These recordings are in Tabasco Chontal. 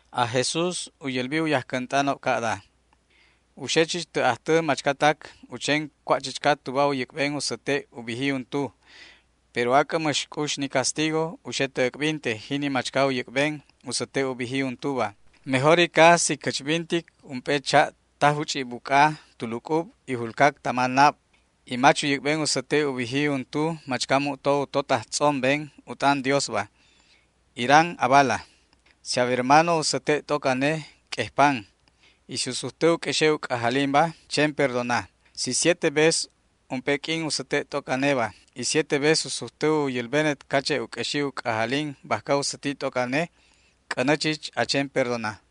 Aj Jesús u yälbi u yajcänt'anob ca'da: ―U xe chich tä ajtä machcatac u chen cua' chichca tuba u yäc'ben u säte' u biji untu, pero ac'ä mäx c'ux ni castigo u xe tä äc'binte jini machca u yäc'ben u säte' u biji untuba. Mejorica u xe tuba si cächbintic ump'e cha' ta juch'i' buc'a tu luc'ub y julcac tama nab y mach u yäc'ben u säte' u biji untu machca mu'to u totaj tz'omben to u t'an Diosba. Iran abala. ’Si a wermano u säte' t'oc ane q'uejpan. Y si u sujtä u q'uexe' u c'ajalinba, chen perdona. Si siete vez ump'e q'uin u säte' t'oc aneba y siete vez u sujtä u yälbenet cache' u q'uexi u c'ajalin bajca u säti t'oc ane, c'änä chich a chen perdona.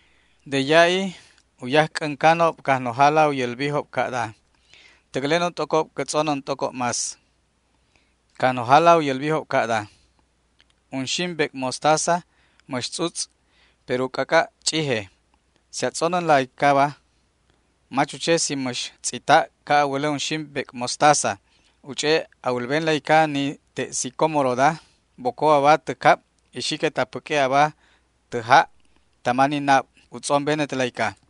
De ya'i u yajc'äncanob Cajnojala u yälbijob ca'da: ―Täclenon t'ocob cä tz'onän t'ocob más. Cajnojala u yälbijob ca'da: ―Unxim bec' mostaza mäx tz'utz', pero u c'ac'a' ch'ije. Si a tz'onänla icaba, mach u che si mäx tz'ita' ca' a wälä unxim bec' mostazaba, u ch'e' a wälbenla ica ni te' sicómoroda: “Boco aba tä cab y xiquet a päq'ue' aba tä ja' tama ni nab”, u tz'ombenetla ica.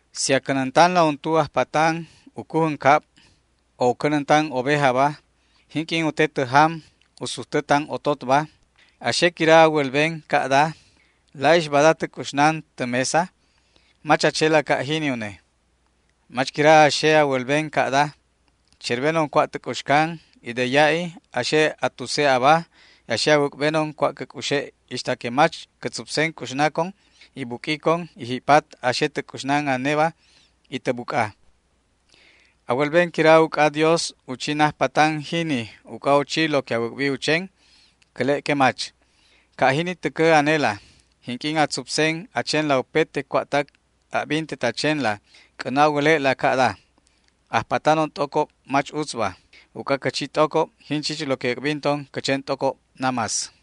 ’Si a cänäntanla untu ajpatan u cujän cab o u cänäntan ovejaba, jinq'uin u te tä jam u sujtä tan ototba, ¿a xe quira a wälben ca'da: “La'ix bada tä c'uxnan tä mesa”? Mach a chela ca' jini une. ¿Mach quira a xe a wälben ca'da: “Cherbenon cua' tä c'uxcan, y de ya'i a xe a tuse' aba y a xe a wäc'benon cua' cä c'uxe' ixta que mach cä tzupsen c'uxnacon y buq'uicon, y ji'pat a xe tä c'uxnan aneba y tä buc'a”? ¿A wälben quira uc'adios u chi najpatan jini uc'a u chi lo que a wäc'bi u chen? Cäle' que mach. Ca' jini täcä anela, jinq'uin a tzupsen a chenla upete cua'tac a'bintet a chenla, c'änä a wäle'la ca'da: “Ajpatanon t'ocob mach utzba, uc'a cä chi t'ocob jin chich lo que äc'binton cä chen t'ocob namás”.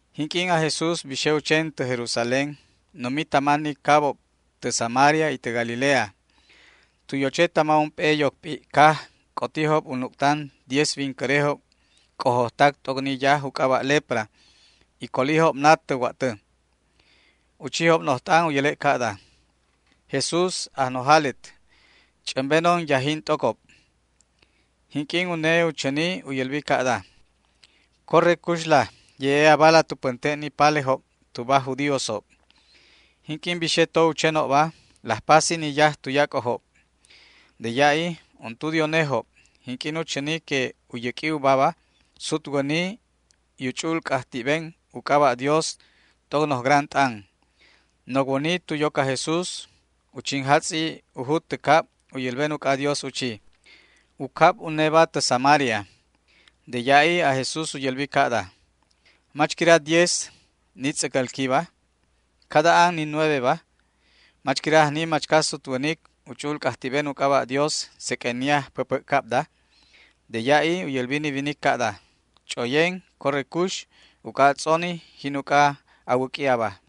Jinq'uin aj Jesús bixe u chen tä Jerusalén, numi tama ni cabob tä Samaria y tä Galilea. Tu yoche tama ump'e yoc p'i' caj c'otijob u nuc'tan diez wincärejob c'ojojtac t'oc ni yaj u c'aba' lepra, y colijob nat tä wa'tä. U chijob noj t'an u yäle' ca'da: ―¡Jesús, Ajnojalet, ch'ämbenon yajin t'ocob! Jinq'uin une u chäni u yälbijob ca'da: ―Corre cuxla ye'e abala tu pänte' ni palejob tuba aj judíosob. Jinq'uin bixe to u chenobba, laj pasi ni yaj tuyac'ojob. De ya'i untu de unejob, jinq'uin u chäni que u yäq'ui ubaba, sutwäni y u ch'u'ul c'ajti'ben u c'aba' Dios t'oc noj gran t'an. Nocwäni tu yoc aj Jesús u chinjatz'i u jut tä cab u yälben uc'adios u chi. U cab uneba tä Samaria. De ya'i aj Jesús u yälbi ca'da: ―¿Mach quira diez ni tz'äcälquiba? ¿Cada an ni nueveba? ¿Mach quira ajni machca sutwänic u ch'u'ul c'ajti'ben u c'aba' Dios seq'uen ni ajpäpä'cabda? De ya'i u yälbi ni winic ca'da: ―Ch'oyen, corre cux, uc'a a tz'oni, jin uc'a a wäq'ui aba.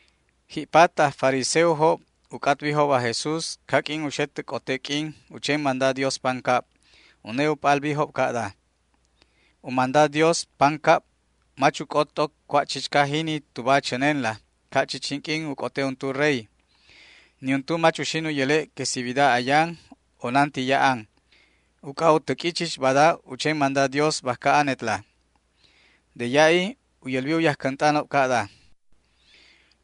Ji'pat aj fariseojob u c'atbijob aj Jesús caq'uin u xe tä c'ote q'uin u chen manda Dios pancab. Une u p'albijob ca'da: ―U manda Dios pancab mach uc'ot t'oc cua' chichca jini tuba a chänenla, ca' chich jinq'uin u c'ote untu rey. Niuntu mach uxin u yäle' que si wida ayan o nanti ya'an, uc'a u täq'ui chich bada u chen manda Dios bajca anetla. De ya'i u yälbi u yajcänt'anob ca'da: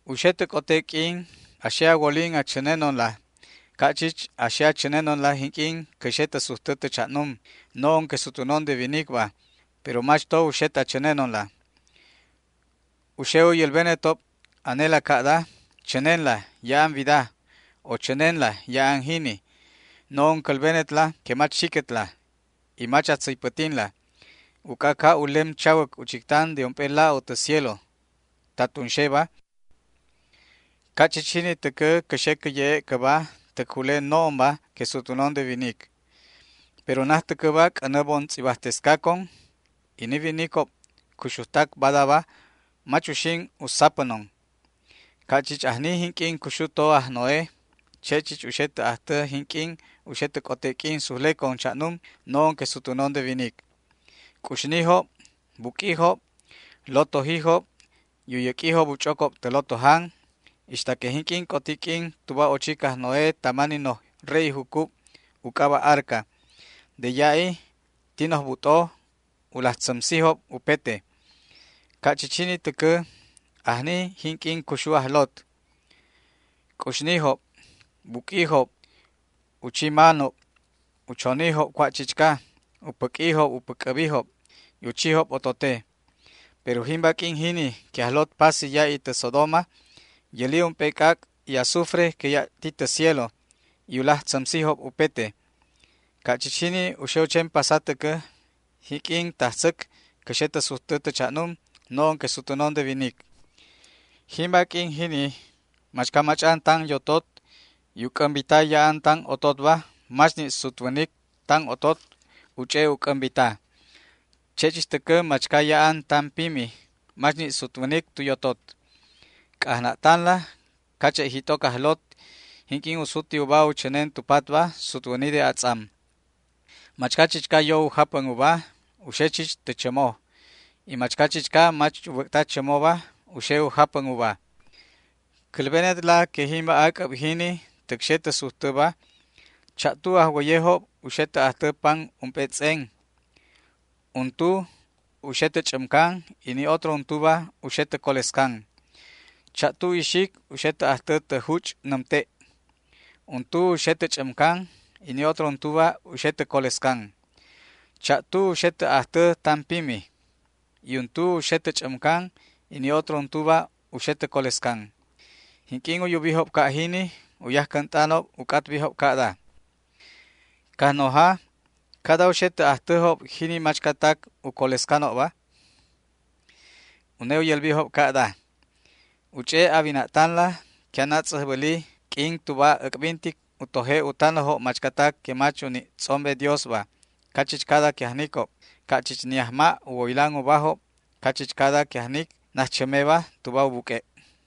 ―U xe tä c'ote q'uin a xe a wolin a chänenonla ca' chich a xe a chänenonla jinq'uin cä xe tä sujtä tä cha'num, no'on que sutwänon de winicba, pero mach to uxet a chänenonla. U xe u yälbenetob anela ca'da: “Chänenla, ya'an wida”, o “Chänenla, ya'an jini”. No'on cälbenetla que mach xiquetla, y mach a tzäypätinla. Uc'a ca' u lem chawäc u chictan de ump'e la'o tä cielo ta tunxeba, ca' chich jini täcä cä xe cä ye'e' cäba täc jule no'onba que sutwänon de winic. Pero najtäcäba c'änä bon tz'ibajtescacon y ni winicob cuxujtac badaba mach uxin u sapänon. Ca' chich ajni jinq'uin cuxu to aj Noé, che' chich u xe tä ajtä jinq'uin u xe tä c'ote q'uin sujlecon cha'num, no'on que sutwänon de winic. C'uxnijob, buq'uijob, lotojijob, y u yäq'uijob u ch'ocob tä lotojan ixta que jinq'uin c'oti q'uin tuba ochic aj Noé tama ni noj re'i jucub u c'aba' arca. De ya'i ti noj but'o u laj tzämsenob upete. Ca' chich jini täcä ajni jinq'uin cuxu to aj Lot. C'uxnijob, buq'uijob, u chi manob, u chonijob cua' chichca, u päq'uijob u päc'äbijob y u chijob otote. Pero jimba q'uin jini que aj Lot pasi ya'i tä Sodoma yäli ump'e c'ac' y azufre que ya' ti tä cielo y u laj tzämsijob upete. Ca' chich jini u xe u chen pasa täcä jinq'uin tajtzäc cä xe tä sujtä tä cha'num, no'on que sutwänon de winic. ’Jimba q'uin jini machca mach'an tan yotot, y u c'ämbita ya'an tan ototba, mach ni' sutwänic tan otot u ch'e' u c'ämbita. Che' chich täcä machca ya'an tan pimi mach ni' sutwänic tu yotot. C'ajna'tanla cache' jit'oc aj Lot, jinq'uin u suti uba u chänen tu patba, sutwäni de atz'am. Machca chichca yo u japän uba u xe chich tä chämo, y machca chichca mach u bäc'ta chämoba u xe u japän uba. ’Cälbenetla que jimba ac'äb jini täc xe tä sujtäba, cha'tu ajwäyejob u xe tä ajtä pan ump'e tz'en. Untu u xe tä ch'ämcan y ni otro untuba u xe tä colescan. Cha'tu ixic u xe tä ajtä tä juch' nämte'. Untu u xe tä ch'ämcan y ni otro untuba u xe tä colescan. Cha'tu u xe tä ajtä tan pimi y untu u xe tä ch'ämcan y ni otro untuba u xe tä colescan. Jinq'uin u yubijob ca' jini, u yajcänt'anob u c'atbijob ca'da: ―Cajnoja, ¿cada u xe tä ajtäjob jini machcatac u colescanob? Une u yälbijob ca'da: ―U ch'e' a wina'tanla que anatz'äjbäli q'uin tuba äc'bintic u toje' u tanäjob machcatac que mach u ni' tz'ombe Diosba cachichcada que ajnicob, ca' chich ni ajma' u woylan ubajob cachichcada que ajnic najchämeba tuba u buq'ue'.